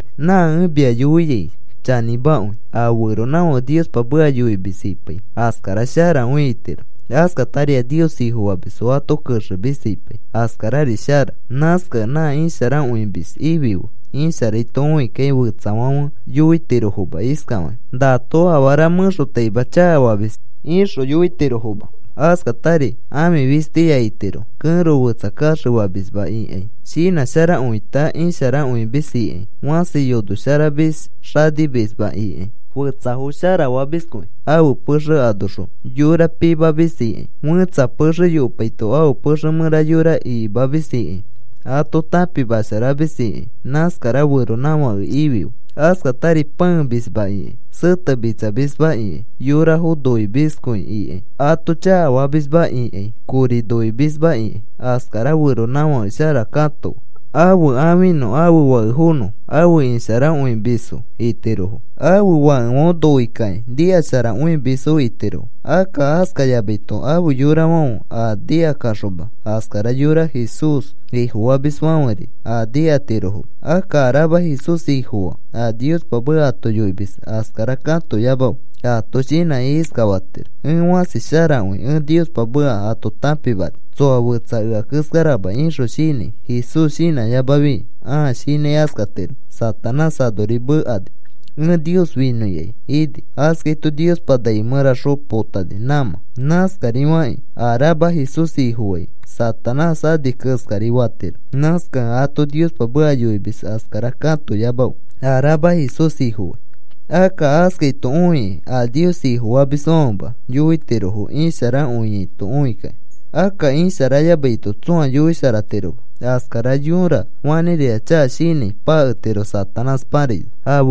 Nã ẽ mia yoiai chanĩmakõi. A feronãfãke Niospa meka yoimis ipai askara sharakõi itiro. Askatari a Nios Ifofamisfo ato kexemis ipai askarari shara. Nãskakẽ nã isharakõimis ifife. Isharaito õikakĩ fetsafãfe yoitirofoma iskafakĩ: “Nato afara mẽxotaima chakafamis,” ixõ yoitirofoma. Askatari ãfi fistiya itiro. Kẽro fetsa kaxefamisma ikãi, shinãsharakõita isharakõimis ikãi, fãsi yonosharamis xanimisma ikãi, fetsafo sharafamiskõi ãfe pexe anoxõ yora pimamis ikãi, fẽtsa pexe yopaito ãfe pexe mẽra yora ikimamis ikãi, ato tãpimasharamis ikãi, nãskara feronãfake ifife. Askatari pãemisma ikãi, setemitsamisma ikãi, yorafo noimiskõi ikãi, ato chakafamisma ikãi, kori noimisma ikãi, askara feronãfake shara katofe. Ãfe ãfinõ ãfe fakefonõ afe isharakõimisfo itirofokĩ. Ãfe fakefãfe noikakĩ nikasharakõimisfo itirofo. Akka askayamaito, afe yorafãfe a nikakaxoma askara yora Jesús Ifofamisfãferi a nikatirofoma. Akka a rama Jesús Ifofaa a Niospa meka ato yoimis askara katoyamafe. Aato shinãki iskafatiro: “Ẽ fãsi sharakõi, ẽ Niospa meka ato tãpimani. Tsoa fetsa ea keskarama,” ixõ shinãi Jesús shinãyamafi ãa shinãi askatiro. Satanás anori mekani: “Ẽ Nios finõikai,” ini. Askaito Niospa nai mẽraxõ potani nãmã. Nãskari fakĩ a rama Jesús Ifofai, Satanás ani keskari fatiro. Nãskakẽ a ato Niospa meka yoimis askara katoyamafe a rama Jesús Ifofai. Akka askaito õikĩ a Nios Ifofamisfãfema yoitirofo isharakõiaito õikakĩ. Akka isharayamaito, tsõa yoisharatiroma. Askara yõra fanĩrira chaka shinãi paketiro Satanás paraino.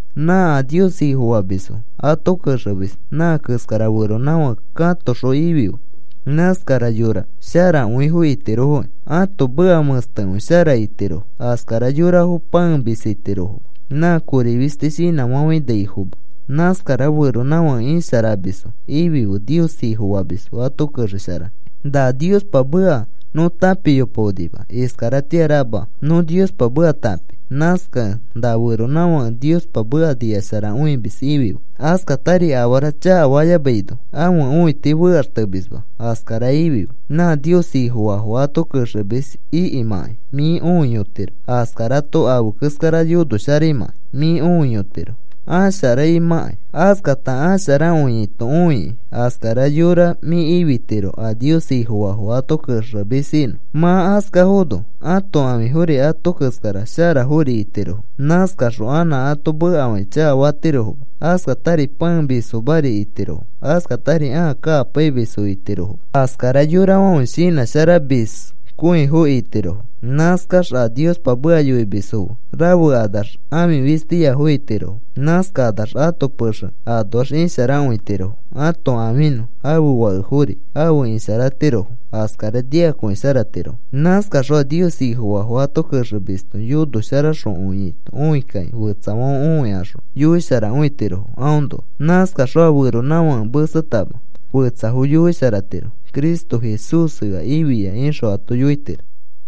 Nã a Nios Ifofamisfo ato kexemis nã keskara feronãfake katoxõ ifife. Nãskara yora sharakõifo itirofo, ãto meka mẽstekõi shara itirofo, askara yorafo pãemis itirofoma, nã kori fisti shinãfafãinaifoma. Nãskara feronãfake isharamisfo ifife Nios Ifofamisfo ato kexesharanõ. Na Niospa meka nõ tãpiyopaonima, iskaratĩa rama nõ Niospa meka tãpi. Nãskakẽ na feronãfãke Niospa meka nikasharakõimis ifife, askatari afara chakafayamaino ãfe õiti fekaxtemisma askara ifife. Nã Nios Ifofaafo ato kexemis ikimãkai mĩ õiyotiro. Askarato afe keskara yonosharaimãkai mĩ õiyotiro asharaimãkai. Askata asharakõiaito õikĩ, askara yora mĩ ifitiro a Nios Ifofaafo ato kexemis inõ. Mã askafono ãto ãfifori ato keskara sharafori itirofo. Nãskaxõ anã ato mekafakĩ chakafatirofoma. Askatari pãemismafori itirofo. Askatari ãa kakapaimisfo itirofoma. Askara yorafãfe shinãsharamiskõifo itirofo. Nãskax a Niospa meka yoimisfo fe rafekanax ãfi fistiyafo itirofo. Nãskakanax ato pexe anoax isharakõitirofo, ãto ãfinõ, ãfe fakefori afe isharatirofo, askara nikakõisharatirofo. Nãskaxõ a Nios Ifofaafo ato kexemisto yonosharakõiaito õikakĩ fetsafãfe õikaxõ yoisharakõitirofo aõnoa. Nãskaxõ a feronãfake mesetama fetsafo yoisharatiro: “Cristo Jesús ea ifia,” ixõ ato yoitiro.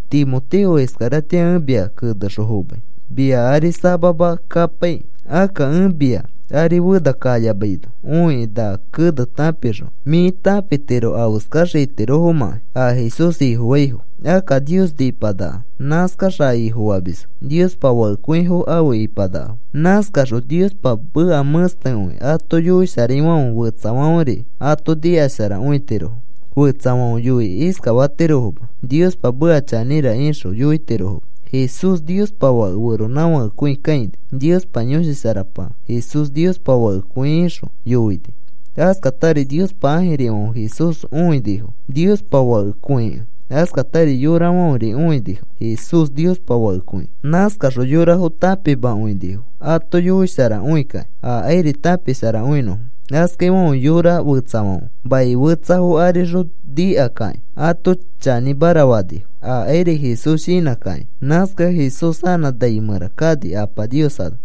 Timoteo, iskaratĩa ẽ mia kenexõ fomai, mia ari samama kapaikĩ. Akka ẽ mia ari fena kayamaino õikĩ na kene tãpixõ mĩ tãpitiro afeskax itirofomãkai a Jesús Ifofaifo. Akka Nios nĩpanaka. Nãskax a Ifofamisfo Niospa fakekõifo afe ipanakafo. Nãskaxõ Niospa meka mẽstekõi ato yoisharaifãfe fetsafãferi ato nikasharakõitirofo. Fetsafãfe yoikĩ iskafatirofoma: “Niospa meka chanĩra,” ixõ yoitirofoma. Jesús Niospa Fake feronãfakekõi kãini. Niospa Yõshi Sharapa, “Jesús Niospa Fakekõi,” ixõ yoini. Askatari Niospa ãjirifãfe Jesús õinifo Niospa Fakekõikẽ. Askatari yorafãferi õinifo Jesús Niospa Fakekõikẽ. Nãskaxõ yorafo tãpimakõinifo ato yoisharakõikakĩ, akairi tãpisharakõinõfo. Askaifãfe yora fetsafãfe mai fetsafo arixõ nikakakĩ ato chanĩmara fanifo akairi Jesús shinãkakĩ. Nãskakẽ Jesús anã nai mẽra kani Apa Nios ano.